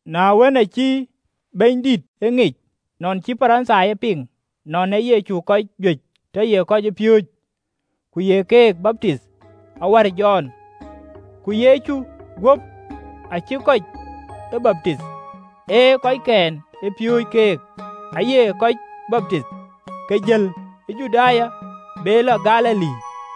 Na wën, acï Bɛ̈nydït e ŋic nɔn cï Parithai ë piŋ nɔn ë Yecu kɔc juëc tɔ ye kɔcpiööcë ku ye keek baptith awär Jɔn. (Ku Yecu guöp aacïï kɔc ë baptith, ee kɔckɛn ë piööcë kek aye kɔc baptith.) Ke jël ë Juda, be lɔ Galili,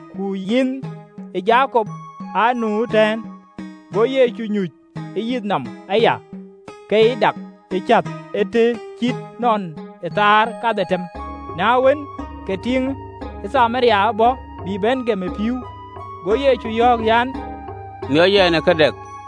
Ku yinh ë Jakop aa nu ëtɛ̈ɛ̈n. Go Yecu nyuc ë yith nɔm aya, ke cï dak ke cäth. Ee të cït nɔn ë thaar kadhetem. Na wën, ke tiiŋ ë Thamaria bɔ̈, bï bɛ̈n gem ë pïïu: go Yecu yɔ̈ɔ̈k an, “Miɔc ɛn ë ka dɛk.”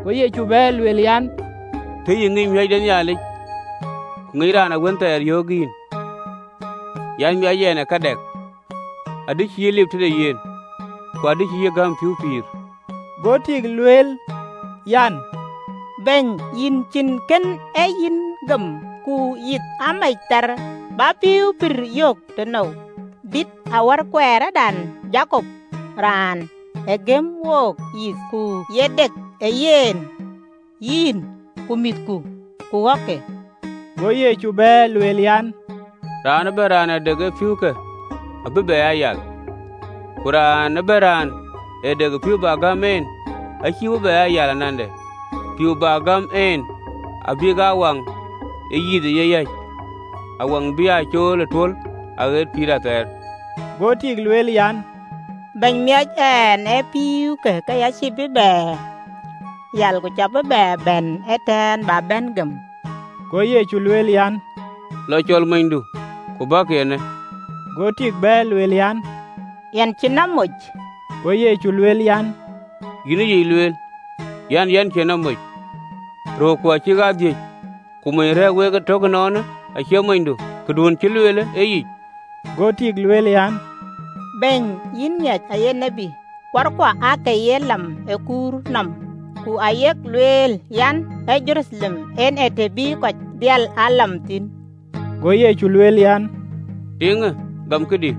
Go Yecu bɛ̈ɛ̈r, lueel an, “Tëë yï ŋic miɔ̈c de Nhialic, ku ŋic raan wën thɛɛr yöök yïn an, “Miɔc ɛn ë ka dɛk, adï cï lip tëde yen, ku adï cï yï gäm pïïu pïïr.” Go tik lueel an, “Bɛ̈ny, yïn cïn kën ee yïn gem, ku yith amec thar, bä pïïu pïïrë yök tënou? Dït awär kuɛɛrdan Jakop, raan ë gëm wook yith, ku ye dek ë ye, yen, ku mïthke, ku ɣɔ̈kke?” Go Yecu bɛ̈ɛ̈r, lueel an, “Raan ëbɛ̈n raan ë dek ë pïïukë abï bɛ aa yal: ku raan ëbɛ̈n raan ë dek ë pïïu bä gäm en acïï bï bɛ aa yal anande, pïïu bä gäm en abïk aa nyin de pïïu ë yeyäc, awaŋ bï aa cool ë tul ɣet pïïr athɛɛr.” Go tik lueel an, “Bɛ̈ny, miɔc ɛn ë pïïuke, ke ya cïï bï bɛ aa yal, ku cä bï bɛ aa bɛ̈n ee tënë bä bɛ̈n gem.” Go Yecu lueel an, “Lɔ, cɔl monydu, ku bäkï eenë.” Go tik bɛ̈ɛ̈r lueel an, “Yɛn cïn nɔm moc.” Go Yecu lueel an, “Yïn ë yic lueel an, yɛn cïn nɔm moc. Röörku acïk aa dhïc, ku mony rɛ̈ɛ̈r wek ëtök ënɔɔnë acie monydu. Këduön cïï lueelë ee yic.” Go tik lueel an, “Bɛ̈ny, yïn ŋiɛc yïn ee tiët. Kuarkuɔ aake ye lam ë kuurë nɔm, ku yak lueel an, ee Jeruthalem en ee të bï kɔc dhil aa lam thïn.” Go Yecu lueel an, “Tiiŋë, gam këdï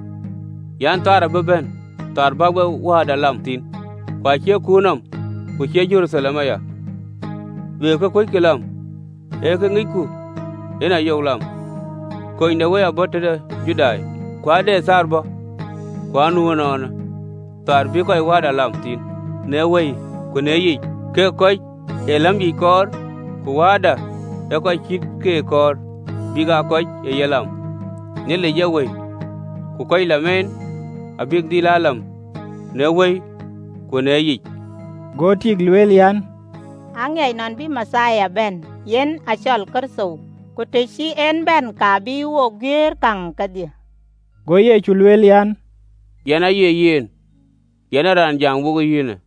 an, ade kööl bï bɛ̈n kööl bä wek Wääda lam thïn, ku acie kuurë nɔm, ku acie Jeruthalem aya. Wek ee kë kuöckï lam: ee kë ŋicku yen ayok lam: kunydewëi abɔ̈ tëde Judai. Ku ade kööl bɔ̈, ku anu ënɔɔnë, kööl bïï kɔc wääda lam thïn në wëi ku në yic, kek kɔc ee läm yic kɔɔr: ku Wääda ee kɔc cït keek kɔɔr bïk aa kɔc ë ye lam. Nhialic ee Wëi, ku kɔc lam en abïk e dhil lam në wëi ku në yic.” Go tik lueel an, “Aŋiɛc nɔn bï Mathia bɛ̈n (yen acɔl Kërtho): ku të cï en bɛ̈n, ka bï wo guëër käŋ kedhie.” Go Yecu lueel an, “Yɛn aye yen, yɛn ë raan jam wo yïn.”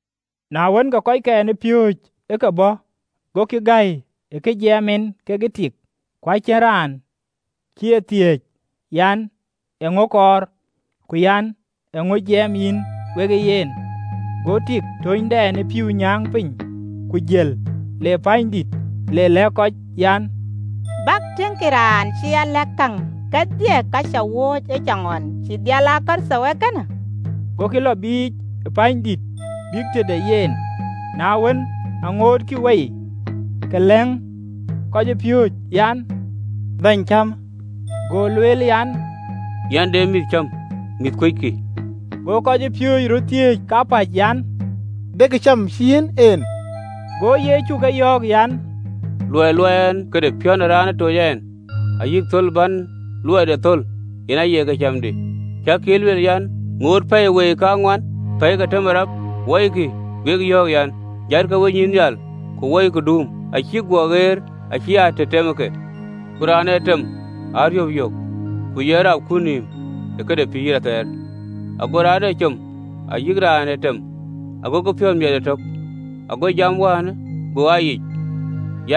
Na wën, ke kɔckɛn ë piööcë ë ke bɔ̈, gokï gäi ë kë jiɛɛm en kekë tik, ku acïn raan cï e thiëëc an, “Eeŋö kɔɔr?” Ku an, “Eeŋö jiɛɛm yïn wekë yen?” Go tik tönydɛn ë pïïu nyääŋ piny, ku jël le pänydït, le lɛ̈k kɔc an, “Bäkï tiëŋkï raan cï a lɛ̈k käŋ kedhie ka cä looi ëcaŋɣɔn: cïï dhil aa Kërtho ee kënë?” Gokï lɔ biic pänydït, bïk tëde yen. Na wën, aŋootkï wei, ke lɛ̈ŋ kɔcpiööcë an, “Bɛ̈ny, cämë!” Go lueel an, “Yɛn de mïïth cam mïïth kuöckï.” Go kɔcpiööcë röt thiëëc kapäc an, “De këcam cï yiɛ̈n en?” Go Yecu ke yɔ̈ɔ̈k an, “Luɔi luɔi ɛn këde piɔ̈n ë raan ë toc ɛn, ayï thöl bän luɔide thöl, yen aye këcamdï. Cäkï ee lueel an, “Ŋoot pɛ̈i wei kaŋuan, pɛ̈i ke tëm ë rap? Wɔikï, wek yɔ̈ɔ̈k an, ‘Jatkï wenyïïn nhial, ku wɔikï duum, acïk guɔ ɣɛɛr, acï aa të tem ëke! Ku raan ë tem ee ariöp yök, ku ye rap kut nïïm ë këde pïïr athɛɛr, ago raan ee com ayï raan ee tem agokï piɔ̈ɔ̈th miɛt ëtök. Ago jam wäänë go aa yic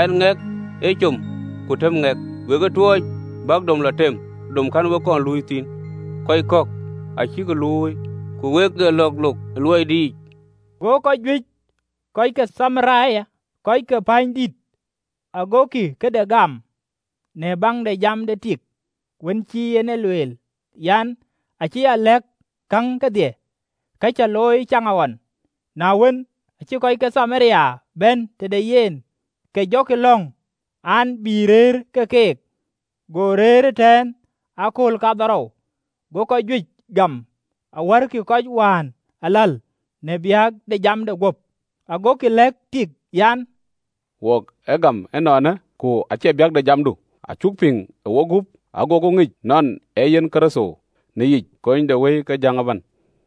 an, ‘Ŋɛk ee com, ku tëm ŋɛk.’ Wek ë tuɔɔc bäk dom lɔ tem dom kɛ̈n wek kɔn luui thïn: kɔc kɔ̈k acïk luui, ku wek ë lɔ̈ɔ̈k löök ë luɔidenic.” Go kɔc juëc kɔc ke Thamaria kɔc ke pänydïïtë agokï këde gam në baŋ de jam de tik, wën cï en ë lueel an, “Acï a lɛ̈k käŋ kedhie ka cä looi ëcaŋɣɔn.” Na wën, aacï kɔc ke Thamaria bɛ̈n tëde yen, ke jɔkï lɔ̈ŋ an, bï rëër ke keek: go rëër ëtɛ̈ɛ̈n ë akööl kaarou. Go kɔc juëc gam awärkï kɔc wään aläl, në biäk de jamde guöp, agokï lɛ̈k tik an, “Wok ë gam ënɔɔnë, ku acie biäk de jamdu: acuk piŋ ë wok gup, agoku ŋic nɔn ee yen Kërtho në yic, konydewëi de jäŋ ëbɛ̈n.”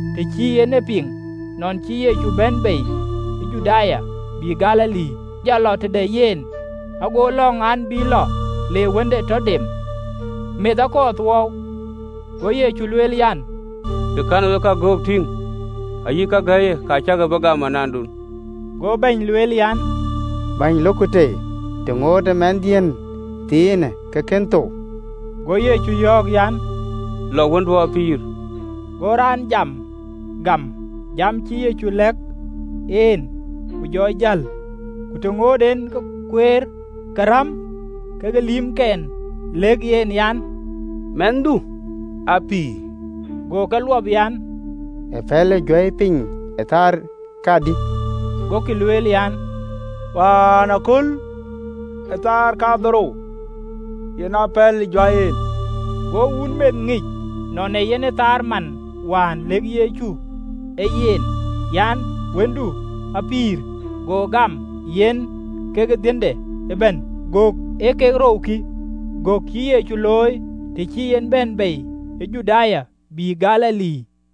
Të cï en e piŋ nɔn cï Yecu bɛ̈n bei ë Juda bïï Galili, ke jɔ lɔ tëde yen, go lɔ̈ŋ an, bï lɔ, le wënde tɔ dem, meth akɔɔr thuɔɔu. Go Yecu lueel an, “Të kɛ̈n wek göök tïŋ ayï kake gäi, ka cäkï bï gam anandun.” Go bɛ̈ny lueel an, “Bɛ̈ny, lokku tei të ŋootë mɛnhdiën thiinë ke kën thou.” Go Yecu yɔ̈ɔ̈k an, “Lɔ wëndu apïïr!” Go raan jam gam, jam cï Yecu lɛ̈k en, ku jɔ jäl. Ku të ŋoot en kueer, ke räm ke lïïmke gokï lɛ̈k yen an, “Mɛnhdu apïïr!” Go ke luɔp an, “Ëpɛ̈lë juäi piny ë thaar kadï?” Gokï lueel an, “Wäänaköl, ë thaar kadhorou, yen aa pɛ̈lë juäi en.” Go wun meth ŋic nɔn ee yen thaar man wään lëkë Yecu ë yen an, “Wëndu apïïr.” Go gam, yen kekë dhiënde ëbɛ̈n. Gök ee kek rou kï, gök cïï Yecu looi, të cï en bɛ̈n bei ë Judaya bïï Galili.